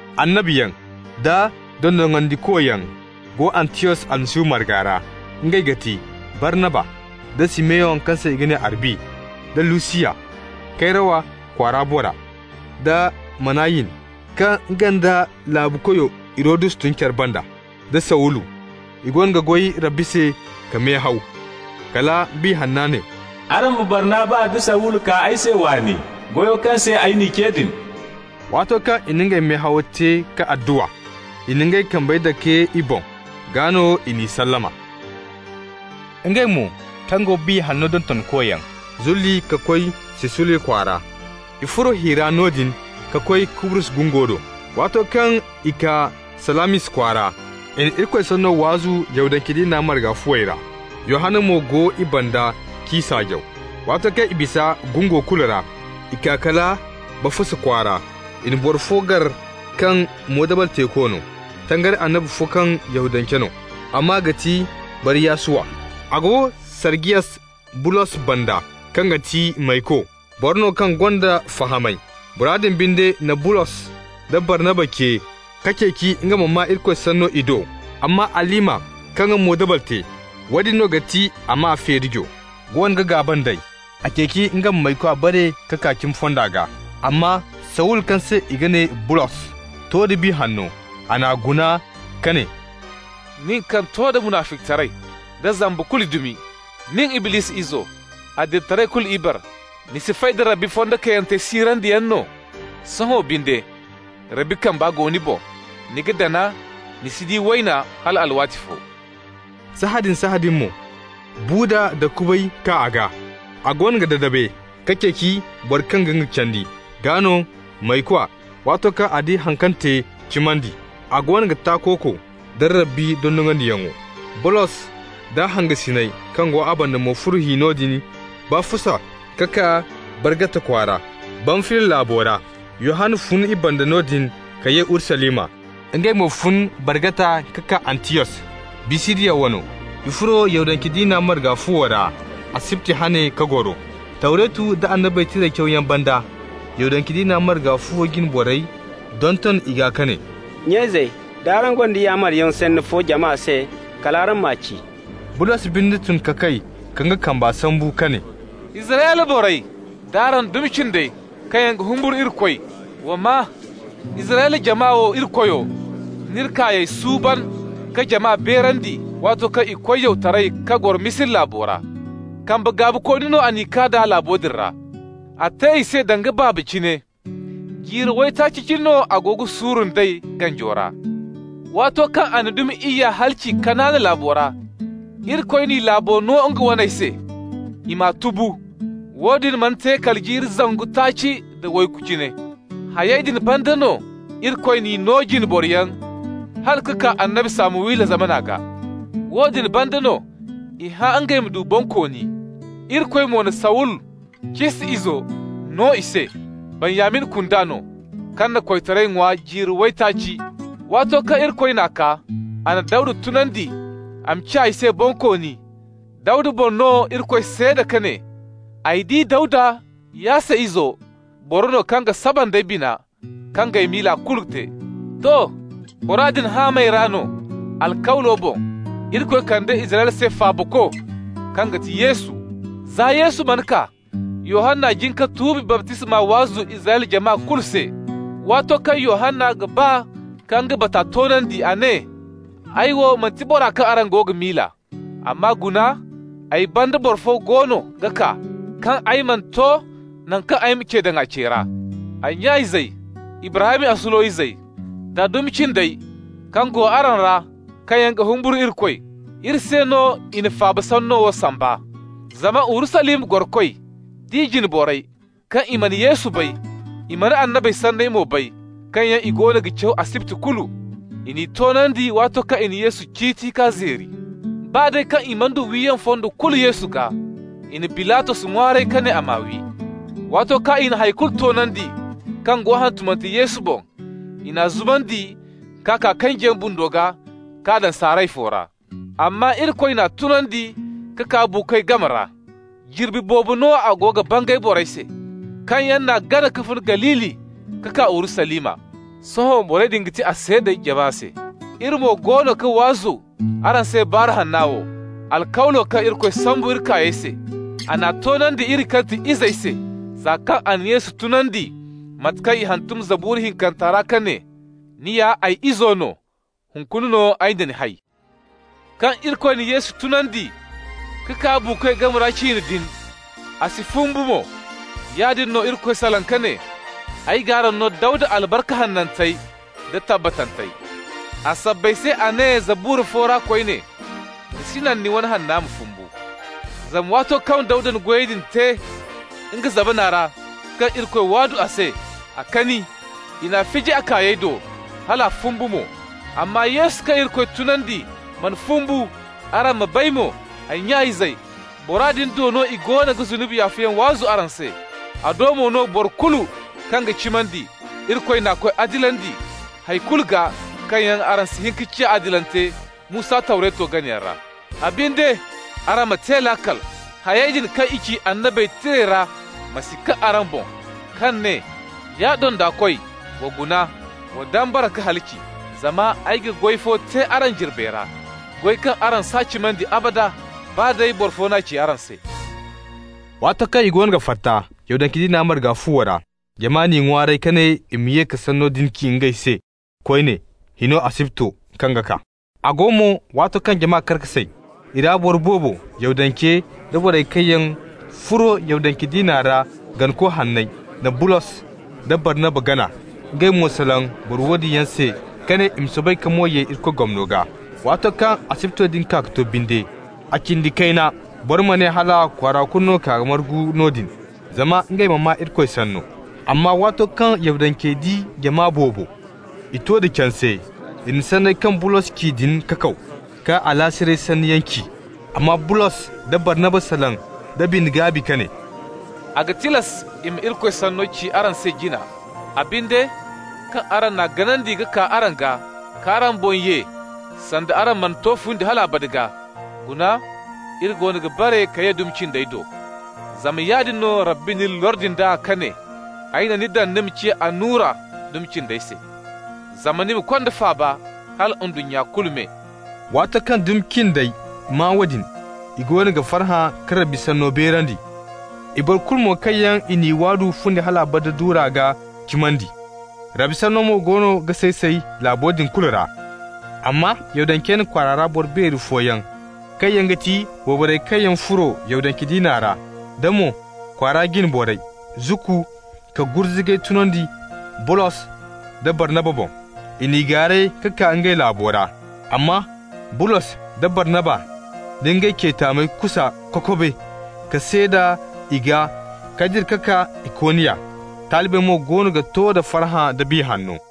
Annabiyaŋ da dondonandikoyaŋ go Antiyos Almasihu marga ra. Ngey ga ti: Barnaba, da Simeyon kaŋ se i ga ne Arbi, da Lusiyas Kayrawa kwaara bora, da Manayin kaŋ nga da laabukoyo Hirodus tun care banda, da Sawulu. I goono ga goy Rabbi se ka mehaw, kala Biya Hanna ne: «Araŋ ma Barnaba da Sawulu kaa ay se waani, goyo kaŋ se ay n'i ce din.» Waato kaŋ i na ngey mehawo te ka adduwa, i na ngey kambey dake i boŋ. Gaa no i n'i sallama. Ngey mo, kaŋ go Biya Hanno dontonkoyaŋ, zulli ka koy Selusiya kwaara. I furo hi ra noodin ka koy Kubrus gungo do. Waato kaŋ i kaa Salamis kwaara, i na Irikoy sanno waazu Yahudance diina marga fuwey ra. Yohanna mo go i banda g'i saajaw. Waato kaŋ i bisa gungo kulu ra, i kaa kala Bafusa kwaara. I na boro fo gar kaŋ moodabal teeko no, tangari annabi fo kaŋ Yahudance no. A maa ga ti Bar-Yasuwa. A go Sarjiyas Bulos banda kaŋ ga ti mayko, boro no kaŋ gonda fahamay. Bora din binde na Bulos da Barnaba ce ka ceeci nga ma maa Irikoy sanno i do. Amma Alima, kaŋ ga moodabal te (woodin no ga ti a maa feerijo), goono ga gaaba nd'ey. A ceeci nga ma maykwa bare k'a kaa cimi fonda gaa. Amma Sawulu, kaŋ se i ga ne Bulos, to da Biya Hanno. A n'a guna ka ne: «Nin kaŋ to da munaficitaray da zamba kulu dumi, nin Iblisi izo, adilitaray kulu ibare, ni si fay da Rabbi fondo kayantey siirandiyaŋ no? Sohõ binde, Rabbi kamba go ni boŋ. Ni ga dana, ni si di wayna hal alwaati fo.» Sahãadin-sahãadin mo, buuda da kubay kaa a gaa. A goono ga dadabe ka ceeci boro kaŋ ga nga candi. Gaa no maykwa, waato kaŋ a di haŋ kaŋ te, cimandi. A goono ga takooko nda Rabbi dondonandiyaŋo. Bulos d'a hangasiney kaŋ go a banda mo furo hi noodin Bafusa ka kaa Bargata kwaara, Bamfiliya laabo ra. Yohanna fun i banda noodin ka ye Urusalima. Ngey mo fun Bargata ka kaa Antiyos, Bisidiya wano. I furo Yahudance diina marga fuwo ra asibti hane ka goro. Tawretu nda Annabey Tirey cawyaŋ banda, Yahudance diina marga fuwo jine borey donton i gaa ka ne: «Nya-izey, d'araŋ gonda yaamaryaŋ sanni fo jama se, kal araŋ ma ci.» Bulos binde tun ka kay ka nga kamba sambu ka ne: «Israyla borey d'araŋ dumi cindey kaŋ yaŋ ga humburu Irikoy, wa maa: Israyla jama wo Irikoyo n'iri kaayey suuban ka jama beerandi waato kaŋ i koy yawtaray ka goro Misira laabo ra. Kambe gaabikooni no a n'i kaa d'a laabo din ra. A te i se danga baaba cine, jiiri waytaaci cine no a go ga suuru nd'ey ganjo ra. Waato kaŋ a na dumi iyya halaci Kanaana laabo ra, Irikoy n'i laabo no nga waney se, i m'a tubu. Woodin mana te kala jiiri zangu taaci nda waygu cine. Hayey din banda no Irikoy n'i no jine boroyaŋ hala ka kaa annabi Samuwila zamana gaa. Woodin banda no i hã ngey ma du bonkooni. Irikoy mo na Sawulu, Cis izo, no i se, Benyamin kunda no, kaŋ na koytaray ŋwa jiiri waytaaci. Waato kaŋ Irikoy n'a kaa, a na Dawda tunandi a ma ciya i se bonkooni. Dawda boŋ no Irikoy seeda ka ne: ‹Ay di Dawda, Yasse izo, boro no kaŋ ga saba nd'ay bina, kaŋ g'ay miila kulu te.› To, bora din haamey ra no, alkawlo boŋ, Irikoy kande Israyla se Faabako, kaŋ ga ti Yesu. Za Yesu mana kaa, Yohanna jin ka tuubi baptisma waazu Israyla jama kulu se. Waato kaŋ Yohanna ga ba ka nga bata toonandi, a ne: ‹Ay wo manti bora kaŋ araŋ go ga miila. Amma guna, ay banda boro fo goono ga kaa kaŋ ay mana to naŋ kaŋ ay ma ce daŋ a ce ra.› Ay nya-izey, Ibrahim asulo izey, da dumi cindey kaŋ go araŋ ra kaŋ yaŋ ga humburu Irikoy, iri se no i na faaba sanno wo samba. Zama Urusalima gorokoy d'i jine borey, kaŋ i mana Yesu bay, i mana annabey sanney mo bay kaŋ yaŋ i goono ga caw asibti kulu, i n'i toonandi waato kaŋ i na Yesu ciiti ka zeeri. Baa day kaŋ i mana du wiyaŋ fondo kulu Yesu gaa, i na Bilatos ŋwaaray ka ne a m'a wi. Waato kaŋ i na hay kulu toonandi kaŋ go hantumante Yesu boŋ, i n'a zumandi k'a kaa kanjiyaŋ bundo gaa, k'a daŋ saaray fo ra. Amma Irikoy n'a tunandi ka kaa buukoy game ra. Jirbi boobo mo no a go ga bangay borey se kaŋ yaŋ n'a gana ka fun Galili ka kaa Urusalima. Sohõ borey din ga ti a seedey jama se. Iri mo goono ga waazu araŋ se Baaru Hanna wo: alkawlo kaŋ Irikoy sambu iri kaayey se, a n'a toonandi iri, kaŋ ga ti i izey se, za kaŋ a na Yesu tunandi, mate kaŋ i hantum Zabura hinkanta ra ka ne: ‹Ni ya ay izo no. Hunkuna no ay na ni hay.› Kaŋ Irikoy na Yesu tunandi ka kaa buukoy game ra ciine din, a si fumbu mo, yaadin no Irikoy salaŋ ka ne: ‹Ay g'araŋ no Dawda albarka hanantey da tabbatantey.› A sabbay se a ne Zabura fo ra koyne: ‹Ni si naŋ ni wane Hanna ma fumbu.› Zama waato kaŋ Dawda na goyo te nga zamana ra kaŋ Irikoy waadu a se, a kani. I n'a fiji a kaayey do, hal a fumbu mo. Amma Yesu kaŋ Irikoy tunandi mana fumbu. Araŋ ma bay mo, ay nya-izey, bora din do no i goono ga zunubi yaafayaŋ waazu araŋ se. A do mo no boro kulu kaŋ ga cimandi, Irikoy n'a koy adilandi hay kulu gaa kaŋ yaŋ araŋ si hin ka ciya adilante Musa Tawreto ganayaŋ ra. A binde, araŋ ma te laakal, hayey din kaŋ i ci Annabey Tirey ra ma si kaŋ araŋ boŋ kaŋ ne: ‹Ya dondakoy, wa guna. Wa dambara ka halaci. Zama ay ga goy fo te araŋ jirbey ra, goy kaŋ araŋ s'a cimandi abada, baa day boro fo n'a ci araŋ se.›» Waato kaŋ i goono ga fatta Yahudance diina marga fuwo ra, jama n'i ŋwaaray ka ne i ma ye ka sanno din ci ngey se koyne hino asibto kaŋ ga kaa. A go mo, waato kaŋ jama kar ka say, i ra boro boobo, Yahudance da borey kaŋ yaŋ furo Yahudance diina ra ganako hanney, na Bulos da Barnaba gana. Ngey mo salaŋ boro woodin yaŋ se ka ne i ma soobay ka mo ye Irikoy gomno gaa. Waato kaŋ asibto din kaa ka to binde, a cindi kayna boro ma ne hala kwaara kulu no ka margu noodin zama ngey ma maa Irikoy sanno. Amma waato kaŋ Yahudancey di jama boobo, i to da canse. I na sanney kaŋ Bulos ci din kakaw, ka alaasiray sanniyaŋ ci. Amma Bulos da Barnaba salaŋ da bine-gaabi ka ne: «A ga tilas i ma Irikoy sanno ci araŋ se jina. A binde, kaŋ araŋ n'a ganandi araŋ gaa, k'araŋ boŋ ye sanda araŋ mana to fundi hal abada gaa, guna, iri goono ga bare ka ye dumi cindey do. Zama yaadin no Rabbi n'iri lordi nd'a ka ne: ‹Ay na ni daŋ ni ma ciya annura dumi cindey se, zama ni ma konda faaba hala ndunnya kulu me.›» Waato kaŋ dumi cindey maa woodin, i goono ga farhã ka Rabbi sanno beerandi. I boro kulu mo kaŋ yaŋ i n'i waadu fundi hal abada duura gaa cimandi. Rabbi sanno mo goono ga say-say laabo din kulu ra. Amma Yahudancey na kwaara ra boro beeri fooyaŋ, kaŋ yaŋ ga ti wayborey kaŋ yaŋ furo Yahudance diina ra, da mo kwaara jine borey, zukku ka gurzugay tunandi Bulos da Barnaba boŋ. I n'i gaaray ka kaa ngey laabo ra. Amma Bulos da Barnaba na ngey ce taamey kusa kokobe ka seeda i gaa ka dira ka kaa Ikoniya. Talibey mo goono ga to da farhã da Biya Hanno.